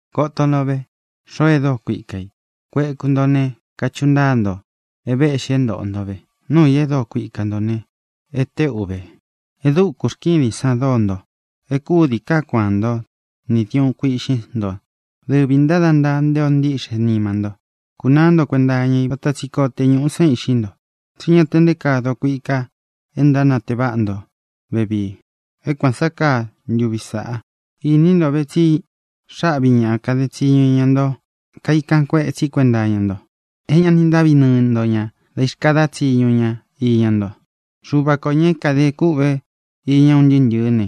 Koto nto ve, xoo e dóo kuika i. Kueku nto ne, kachuꞌu ntáa nto é vēꞌxi é ntōꞌo nto ve. Nuu i é dokuika nto ne, e téꞌu ve. E dúku rkídin san dóo nto. É kúdī kaá kuaán nto nī diuꞌún kuīꞌxín nto. Dɨvi ntāda ntaa nté ō ntíꞌxe nima nto. Kunaá nto kuenta iña i vata tsi koo te ñuꞌú san iꞌxi nto. Tsí ña te nté kaa dokuika e ntánatee váꞌa nto vevii, é kuān sá kaa ntuví sāꞌa. Ini nto ve, tsi xáꞌvī ña kade tsiñu iñá nto kaikan kuetsi kuenta iña nto, é ña ni ntáꞌvi nɨɨ nto ña dā ixkadá tsiñu ña iña nto. Xuva kō, ña é kadē kûꞌve iña un ntɨɨ́ ntɨ̄ɨ́ ne,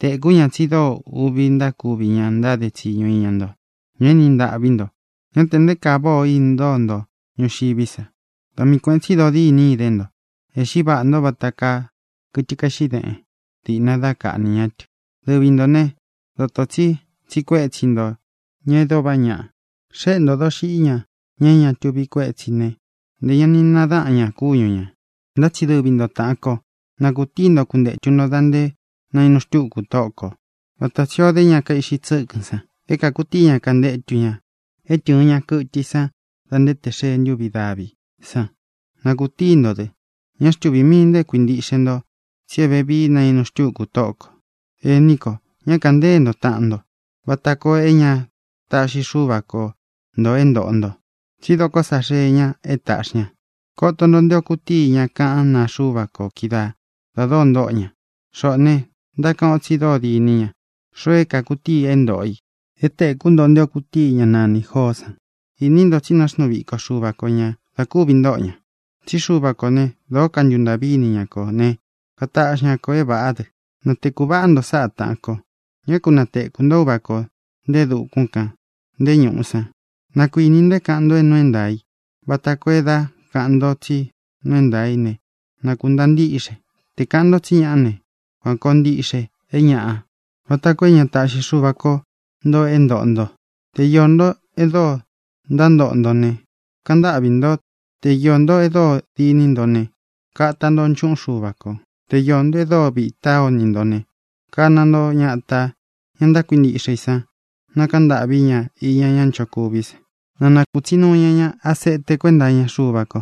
tēkú ña tsi dóo uꞌvi ntákuvi ña ntáde tsiñu iña nto, ña e éni ntaꞌví nto. Ñá tē nté kaa váꞌa o intóo nto ñuxiví sa. Da mii kuēꞌen tsi dodíni idé nto. Ēꞌxí vaꞌā ntó vata kaa kɨtɨ kaeꞌxi déꞌen diꞌna dá kaꞌnī ñá tɨ. Dɨvi ntō né, dōto tsi tsiꞌi kuétsi nto ña e dóo vaꞌá ñaꞌa. Xéꞌe ntō doxiꞌí ña, ña é ña tuvi kuétsi ī né, ntē ña ni nadáꞌan ña kúñu ñā. Ntá tsi dɨvi nto, tāꞌan kó, na kūtíi nto kuntetu nto da nté nainu xtuku Tóꞌo kō, vata tsī ó de ña kaiꞌxi tsɨ́kɨn san é kākutíi ña kantétu ña é tɨɨ̄n ña kɨtɨ i san da nté tē xee ntúvi daví san. Na kūtíi ntō dɨ. Ñá xtuvī mii nto é kuintiꞌxe nto, tsi é vevií nainu xtuku Tóꞌo kō. Ení ko, ñá kāꞌan ntée nto taꞌan nto vata koo é ña táꞌxi Xuva ko ntō é ntōꞌo nto. Tsí doko sa xée ña é tāꞌxi ña. Koto nto nté ō kutíi ña kaꞌán naa Xuva ko kídaā da dóo ntóꞌo ña. Xoꞌō ne, ntákaꞌan o tsi dóo diní ña, xoo é kākutíi e ntóꞌo i. É tēkú nto nté ō kutíi ñá nanī Joó san. Ini nto tsi náxnuu viko Xuva ko ñā da kúvi ntóꞌo ña. Tsí Xuva kō ne, dóo kantuntaꞌví ini ña kō ne, kataꞌxi ña ko é vāꞌá dɨ. Na tēkú vaꞌā nto sáꞌā, taꞌan ko. Ñá ku natekū nto Uva kō, nté e dukún kān, nté ñūꞌu san. Na kuinī nto é kāꞌan nto é nuu é ntaā í vata koo é dá kāꞌan nto tsí nuu é ntaā í ne, na kūntaa ntíꞌxe. Te kāꞌan nto tsí ñaꞌa ne, kuan kōo ntiꞌxe é ñaꞌa, vata koo é ña taꞌxi Xuva ko nto é ntōꞌo nto. Te iō ntó e dóo ntántoꞌo nto ne, kaꞌan ntáꞌvi nto. Te iō ntó e dóo diní nto ne, kata nto nchuꞌún Xuva kō. Te iō ntó e dóo vitá o ini nto ne, kana nto ñatā, ña ntákuintiꞌxe i san, na kāꞌan ntâꞌví ña iña ña nchokuví san. Na nakūtsi nuu ña ña asete kuenta iña Xuva ko.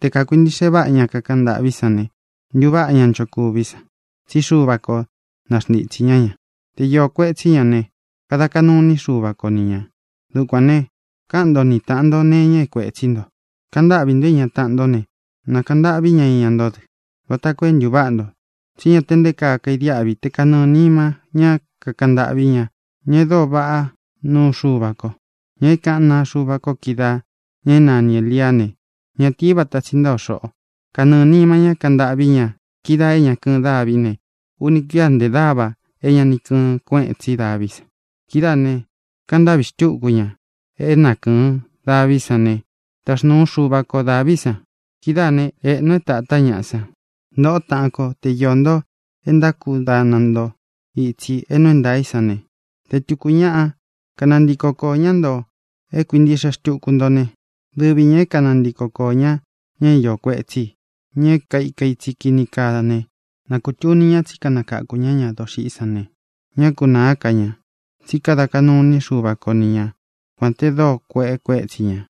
Te kākuintiꞌxe váꞌa ña kakaꞌan ntâꞌví san ne, ntuváꞌa ña nchokuví san, tsí Xuva ko naxntitsī ñá ña. Te iō kuetsí ña ne, kada kaꞌnu iní Xuva ko ni ñā. Dukuān ne, káꞌan nto ni tāꞌan nto nee iña é kuētsí nto. Kaꞌan ntáꞌvī ntó iña taꞌan ntó ne, na kāꞌan ntâꞌví ña iña nto dɨ, vata koo é ntuváꞌa nto. Tsi ñá te nté kaa kaidiáꞌvi te kanɨɨ̄ nima ñá kakaꞌan ntâꞌví ña, ña e dóo vaꞌá nuu Xuva ko. Ña é kāꞌan naa Xuva ko kídaā, ña é nani Ēliá ne, ñatii vata tsi ntáa o xoꞌō. Kanɨɨ̄ nima ñá kaꞌan ntâꞌví ña kídaā é ña kɨɨn dávi ne, uni kuía ntē dáva é ña nī kɨɨn kuéꞌen tsi daví san. Kidáā ne, kaꞌan ntâꞌvi xtúku ña é na kɨ̄ɨn daví san ne, taxnuu Xuva ko dāví san. Kidáā né, ēꞌnu é tātá ñaꞌa san. Ntōꞌo táꞌān kó, te iō nto é ntákudana nto itsi é nuu é ntaā í san ne, te tūku ñaꞌa kanantiko koō ñá nto é kuintīꞌxe xtuku ntó ne, dɨvi ñā é kanantiko koō ñá ña é iō kuetsí i, ña é kaika itsi kini kaa ne, na kūtuni ña tsí kanakáku ña ña doxiꞌí san ne, ñá kunāá ka ña, tsí kada kaꞌnu iní Xuva ko ni ña, kuān te dóo kueꞌe kuétsi ñā.